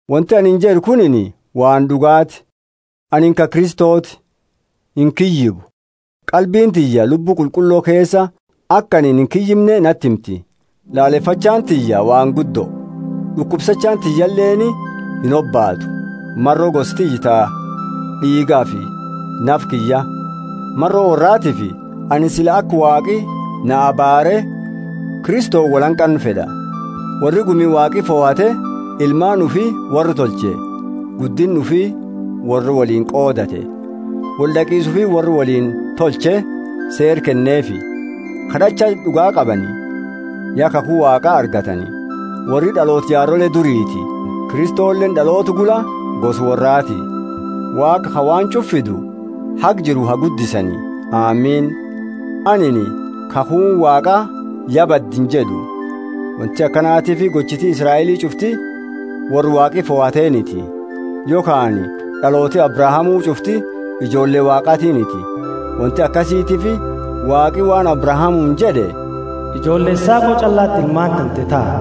Wonti anini jed'u kunini waan d'ugaati; anini ka Kristoti, inkiyyibu. Qalbiini tiyya, Lubbu Qulqullo keesa, aka anini inkiyyimne nati himti. Lalefachaani tiyya waan guddo, d'ukubsachaani tiyyaleeni inhobaatu, maro gosa tiyya ta d'iigafi nafa kiyya. Maro worraatiifi anini sila aka Waaqi na abaarre, Kristoni woli hanqannu fed'a. Worri gumi Waaqi fohate; ilmaani ufi worra tolche, guddinna ufi worra woliini qoodate; wold'aqisa ufi worra woliini tolche Seera kenneefi; kad'acha d'uga qabani; ya kakhu Waaqa argatani; worri d'aloota jaarole duriiti, Kristoleeni d'aloota gula gosa worraati. Waaqa ka waan ch'ufa fidu haga jiru ha guddisani! Amini. Anini, kakhuuni Waaqa ya badde injed'u; wonti akanatiifi gochiti Israeli ch'ufti worra Waaqi fohateniti. Yokhaani d'alooti Abrahamu ch'ufti ijoolle Waaqatiniti; wonti akasiitifi Waaqi waan Abrahamuuni jed'e, Ijoolle Isaaqo ch'allati ilmaani tante taha.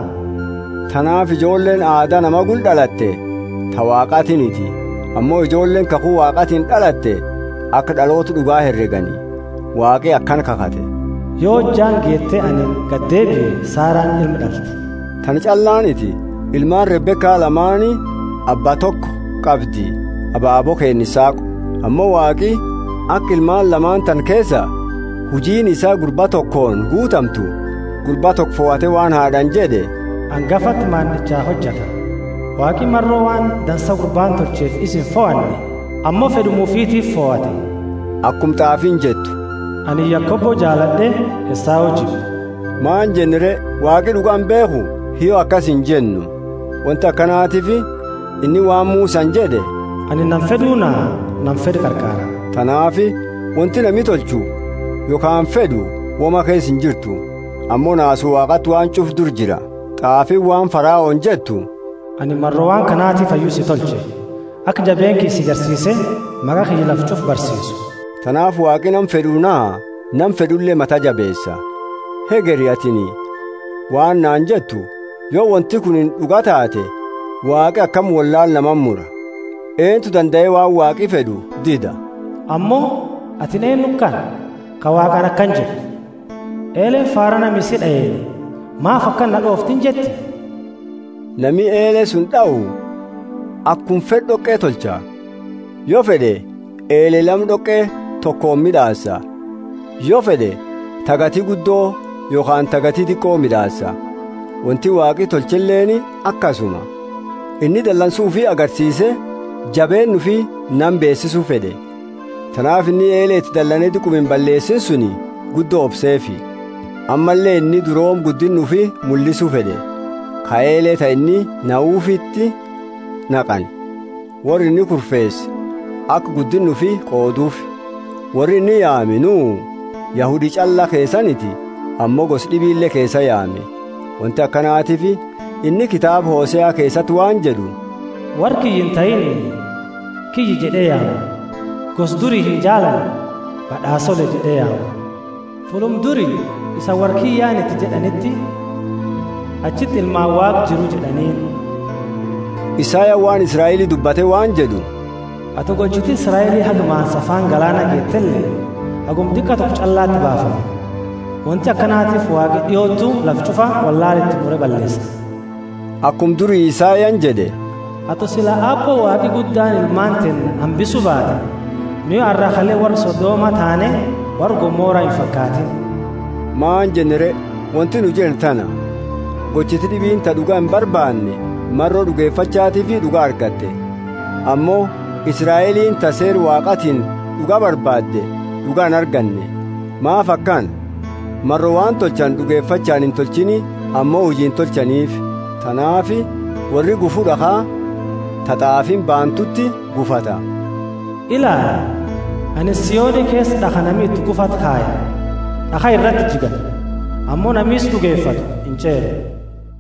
Tanaafi ijoolleeni aada nama gula d'alatte ta Waaqatiniti; ammo, ijoolleeni kakhu Waaqatiini d'alatte aka d'aloota d'uga heregani. Waaqi akana kakhate, Yo hojjaani geete anini gadeebie Saraani ilma d'alti. Tana ch'allaaniti. Ilmaani Rebeka lamaani abba toko, qabdi abaabo keenna Isaaqo. Ammo Waaqi aka ilmaani lamaani tana keesa, hujiini isaa gurba tokooni guutamtu, gurba toko fohate waan haad'aani jed'e, Angafati maand'icha hojata. Waaqi maro waan dansa gurbaani tolcheefi isa infohanne ammo fed'uma ufitiifi fohate. Akuma t'aafiini jettu, Anini Yakobo jaalad'e Esau jibbe. Maani jenna re? Waaqi d'uga imbeekhu? Hiyyo, akasi injennu. Wonti akanatiifi inni waan Musani jed'e, Anini nama fed'u naha, nama fed'u qarqaara. Tanaafi wonti nami tolchu yokhaani fed'u woma keesa injirtu, ammo naasu Waaqaati waan ch'ufa dura jira. T'aafiini waan Faraoni jettu, Anini maro waan kanatifi hayyu si tolche, aka jabeenna kiyya si garsiise maqa kiyya lafa ch'ufa barsiisu. Tanaafi Waaqi nama fed'u naha, nama fed'ule mata jabeesa. Hegeri atini waan naani jettu, Yo wonti kunini d'uga taate, Waaqi akami wollaala namati mura? Eentu dandae waan Waaqi fed'u dida? Ammo, atini eennu kana, ka Waaqaani akana jettu? Eeleeni faara nama isi d'aeeni, Maafi akana na d'oofta injetti? Nami eele suni d'au, akuma fed'u d'oqe tolcha, yo fed'e eele lama d'oqe tokooni mid'aasa, yo fed'e ta gati guddo yokhaani ta gati diqo mid'aasa. Wonti Waaqi tolcheleeni akasuma. Inni dalansu ufi agarsiise jabeenna ufi nama beesisu fed'e. Tanaafi inni eele iti dalane diquma imballeesini suni guddo obseefi. Ammalle inni durooma guddinna ufi mullisu fed'e, ka eele ta inni nahufiti naqani, worra inni kurfeese aka guddinna ufi qooduufi. Worri inni yaame nuu, Yahudi ch'alla keesaaniti ammo gosa d'ibile keesaa yaame. Wonti akanatiifi inni kitaaba Hosea keesati waan jed'u: Worra kiyya intahiini, Kiyya jed'e yaama, gosa duri injaalanne, Bad'aasoole jed'e yaama. Fulluma duri, isani worra kiyyaaniti jed'aniti, achiti Ilmaani Waaqa Jiru jed'aniini. Isayani waan Israeli dubbate waan jed'u: Ato gochiti Israeli haga maansa afaani galaana geetele, haguma diqa toko ch'allati baafama; wonti akanatiifi Waaqi d'iotu lafa ch'ufa wollaala iti mure balleesa. Akuma duri Isayani jed'e, Ato sila Aabbo Waaqi guddaani ilmaani teenna hambisu baate, nu ya arra kale worra Sodoma taane worra Gomora imfakaatini. Maani jenna re? Wonti nu jennu tana: Gochiti d'ibiini ta d'uga imbarbaanne maro d'ugefachatifi d'uga argatte; ammo Israeliini, ta Seera Waaqaatiini d'uga barbaadde d'uga inarganne. Maafi akana? Maro waan tolchani d'ugefachaani intolchiini ammo hujiini tolchanifi. Tanaafi worri gufu d'akhaa, ta t'aafiini baantuti gufata: Ilaali, anini Sioni keesa d'akha nami iti gufatu kaya, d'akha irati jigani. Ammo nami isa d'ugefatu inch'eeru.